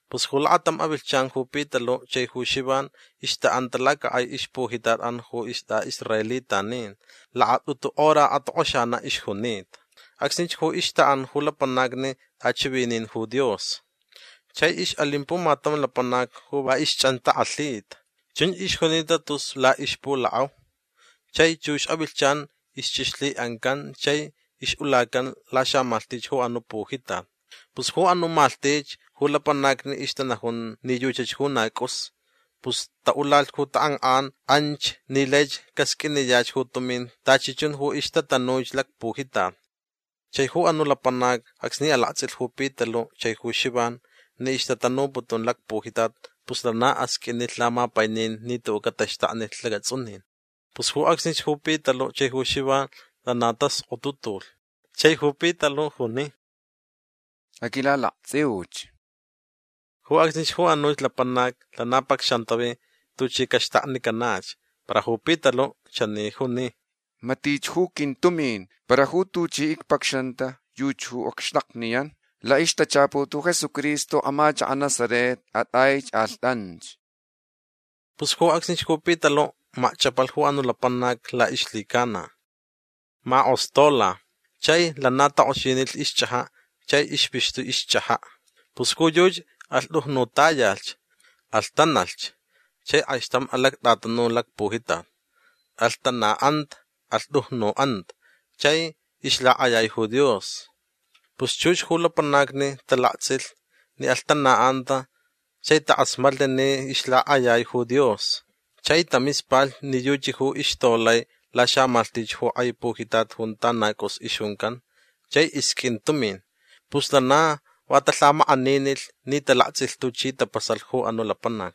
Pus ju lakatam avilhchan ju Pitalu' chai ju Xivan ixta'anta lacak'ai ixpujitat'an ju ist'a'israelitanin. Lakat'utu hora atok'oxana' ixjunita. Acsnich ju ixta'an ju lapanacni t'achivinin ju Dios. Chai ix'alin pumatam lapanac ju va ixch'antak'alhita. Chunch ixjunita tus la'ixpulak'au. Chai chux avilhchan ixch'ixlhi'ancanta chai ix'ulacanta laxamalhtich ju anu' pujitat. Pus ju anu' malhtich ju lapanacni ixtanajun ni yuchach ju na c'us. Pus ta'ulalh ju tak'ank'an anch ni laich casq'uiniyach ju tumin tachi chun ju ixtatanuich lacpujitat. Chai ju anu' lapanac acsni alakts'ilh ju Pitalu' chai ju Xivan ni ixtatanuputun lacpujitat pus lana asq'uinilh lamapainin ni tu'u' cataxtaknilh lacats'unin. Pus ju acsnich ju Pitalu' chai ju Xivan lana taskotutulh. Chai ju Pitalu' juni: ―Aquilalakts'iuch. Ju acsnich ju anuch lapanac lana pacxantavi tuchi caxtaknicanach. Para ju Pitalu' chani junich: ―Matich ju quintumin. Para ju tuchi icpacxanta yuchach ju acxtakniyan. La'ixtachaput ju Jesucristo amachaka' Nazaret at'aich. Alht'anch. Pus ju acsnich ju Pitalu' makch'apalh ju anu' lapanac la'ixlhicana. Mak'ostola. Chai lana tak'oxinilh ixch'aja' chai ixpixtu' ixch'aja'. Pus ju yuchi alhtujnutayalhch. Alhtanalhch chai k'aixtam alact'atanu lacpujitat. Alhtana'anta. Alhtujnu'anta. Chai ixlak'ayai ju Dios. Pus chux ju lapanacni talakts'ilh ni alhtana'anta chai tak'asmatlh ni ixlak'ayai ju Dios. Chai tamispalh ni yuchi ju ixtolai laxamalhtich ju k'ai pujitat junta na c'us ixjuncan chai isq'uin tumin. Pus lana va talhamak'aninilh ni talakts'ilh tuchi tapasalh ju anu' lapanac.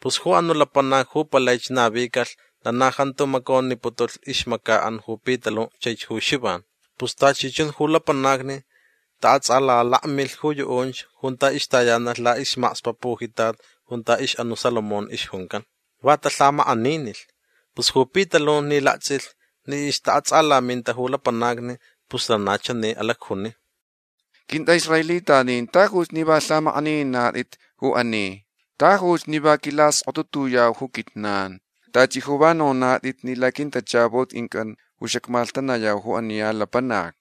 Pus ju anu' lapanac ju palaich navicalh lana jantu maconiputulh ixmaca'an ju Pitalu' chaich ju Xivan. Pus tachi chun ju lapanacni ta'ats'alalakmilh ju yu'unch junta ixtayanalh la'ismakspa' pujitat junta ix'anu' Salomón ixjuncan. Va talhamak'aninilh. Pus ju Pitalu' ni lakts'ilh ni ixta'ats'alaminta ju lapanacni pus lana chani alacjuni: ―Quint'a'israelitanin tajuch ni va lhamak'anininat'it ju ani. Tajuch ni va quilaskotutuyau ju quijnan. Tachi ju va nonat'it ni laquintachaput quinc'an ju xacmalhtanayau ju ani ya lapanac.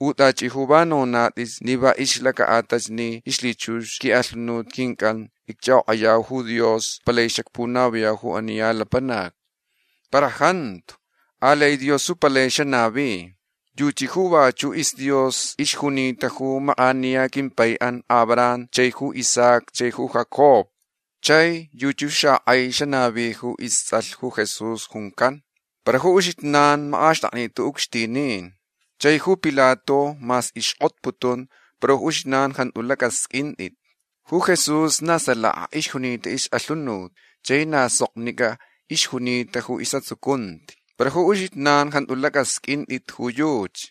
U tachi ju va nonat'it ni va ixlaca'atalh ni ixlhichux ju qui'alhunut quinc'an icch'ak'ok'ayauch ju Dios palaich xacpunaviyau ju ani ya lapanac. Para jantu. Alai Dios ju palai xanavi. Yuchi ju vachu' isDios ixjunita ju mak'aniya quimpai'an Abraham chaich ju Isaac chai ju Jacob. Chai yuchi ju xak'ai xanavi ju ists'alh ju Jesús juncan. Para ju uxijnan mak'axt'aknit'it ju ucxtinin. Chai ju Pilato mas ixk'otputun para ju uxijnan jantu lac'asq'uint'it. Ju Jesús na salaka ixjunita ix'alhunut chai na soknic'a ixjunita ju is'atsucunti. Para ju uxijnan jantu lac'asq'uint'it ju yuchi.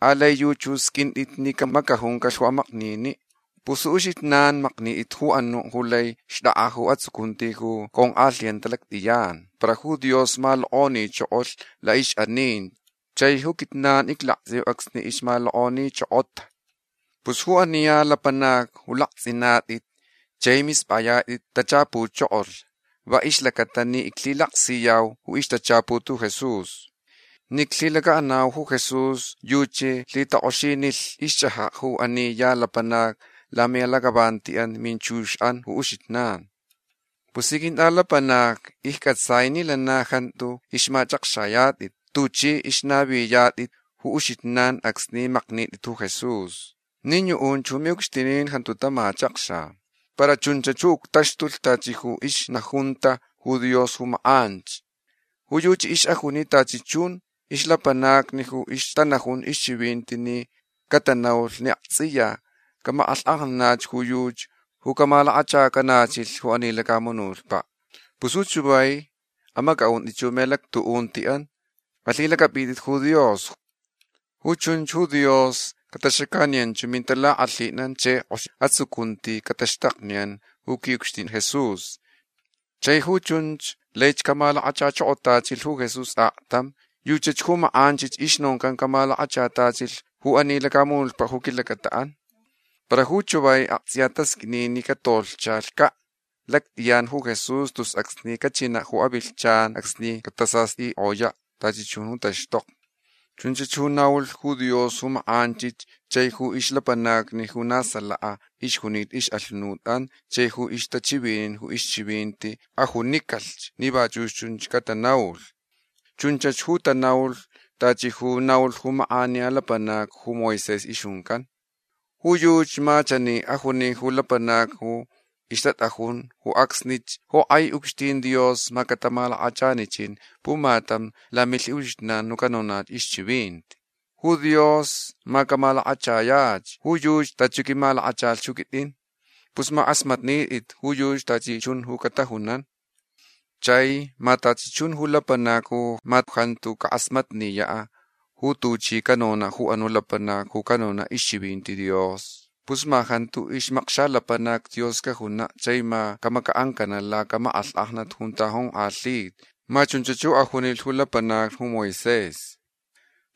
Alai yuchi ju sq'uint'it ni camacajuncalh ju amaknini'. Pus ju uxijnan maknit'it ju anu' ju lai xt'ak'a ju atsucunti ju conk'alhiyanta lact'iyan. Para ju Dios malok'onichokolh la'ix'aninti. Chai ju quijnan iclakts'iuch acsni ixmalok'onichokotach. Pus ju ani ya lapanac ju lakts'inat'it chai misp'ayat'it tachapuchokolh va ixlacata ni iclhilaksiyau ju ixtachaput ju Jesús. Ni iclhilaca'anau ju Jesús yuchi lhitak'oxinilh ixch'aja' ju ani ya lapanac lami'alac'avanti'an minchux'an ju uxijnan. Pus ji quint'alapanacni icc'atsai ni lana jantu ixmach'akxayat'it tuch'i ixnaviyat'it ju uxijnan acsni maknit'it ju Jesús. Nin yu'unch ju mi'ucxtinin jantu tamachakxa. Para chunch ju uctaxtulh tachi ju ixnajunta ju Dios ju mak'anch. Ju yuchi ix'ajuni tachi chun ixlapanacni ju ixtanajun ixchivinti ni catanaulh ni akts'iya camak'alhk'ajnanach ju yuchi ju camalakachacanachilh ju ani lacamunutpa'. Pus ju chavai amac'a'unt'it ju mi'alactu'unti'an. Alhilac'ap'it'it ju Dios. Ju chunch ju Dios cataxacaniyanch ju mintalak'alhin'an chai k'ox atsucunti cataxtakniyan ju qui'ucxtin Jesús. Chai ju chunch laich camalakachachokotachilh ju Jesús aktam. Yuchach ju mak'anchich ixnoncan camalakachatachilh ju ani lacamunutpa' ju quilacata'an. Para ju chavai akts'iya tasq'uini ni catolhchaca' lact'iyan ju Jesús tus acsni cachina' ju avilhchan acsni catasast'ik'oya' tachi chun ju taxtokni. Chunch ju naulh ju Dios ju mak'anchich chai ju ixlapanacni ju na salaka ixjunita ix'alhunut'an chai ju ixtachivinin ju ixchivinti ajunicalh ni vachu' chunch catanaulh. Chunch ju tanaulh tachi ju naulh ju mak'aniya lapanac ju Moisés ixjuncan. Ju yuchi ma chani ajuni ju lapanacni ju ixtat'ajun ju acsnich: “Ju k'ai ucxtin Dios ma catamalakachanichin pumatam lamilhi'uxijnan ju canonach ixchivinti. Ju Dios ma camalakachayach ju yuchi tachi ju quimalakachalh ju quit'in. Pus ma ak'asmatnit'it ju yuchi tachi chun ju catajunan. Chai ma tachi chun ju lapanacni ju ma jantu cak'asmatniya' ju tuchi canona' ju anu' lapanac ju canona' ixchivinti Dios pus ma jantu ixmakxalapanac Dios cajuna' chai ma camaca'ancana' lacamak'alhk'ajnat junta jonk'alhita”. Ma chunch ju ajunilh ju lapanacni ju Moisés.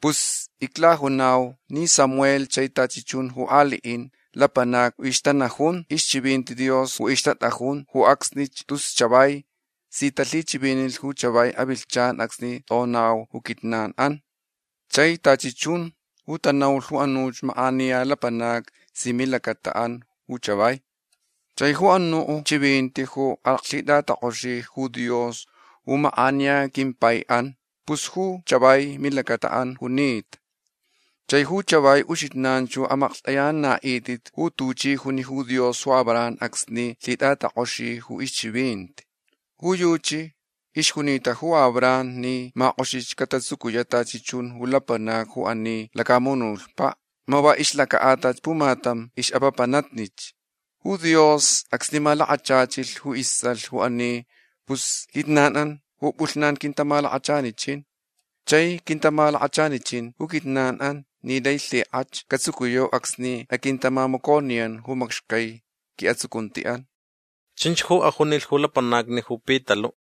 Pus iclajunau ni Samuel chai tachi chun ju ali'in lapanacni ju ixtanajun ixchivinti Dios ju ixtat'ajun ju acsnich tus chavai si talhichivinilh ju chavai avilhchan acsni t'onau ju quijnan'an. Chai tachi chun ju tanaulh ju anuch mak'aniya lapanacni si milacata'an ju chavai. Chai ju anu' chivinti ju alaclhit'atak'oxilh ju Dios ju mak'aniya quimpai'an pus ju chavai milacata'an junita. Chai ju chavai uxijnan ju amaklht'ayanana'it'it ju tuchi juni ju Dios ju Abraham acsni lhit'atak'oxilh ju ixchivinti. Ju yuchi ixjunita ju Abraham ni ma k'oxich catatsucuya' tachi chun ju lapanacni ju ani lacamunutpa' ma va ixlaca'atalh pumatam ix'apapanatnich. Ju Dios acsni malakachachilh ju ists'alh ju ani pus quijnan'an ju p'ulhnan quintamalakachanichin. Chai quintamalakachanichin ju quijnan'an ni lai lhik'ach catsucuyau acsni aquintamamaconiyan ju macxcai qui'atsucunti'an. ―Chunch ju ajunilh ju lapanacni ju Pitalu'.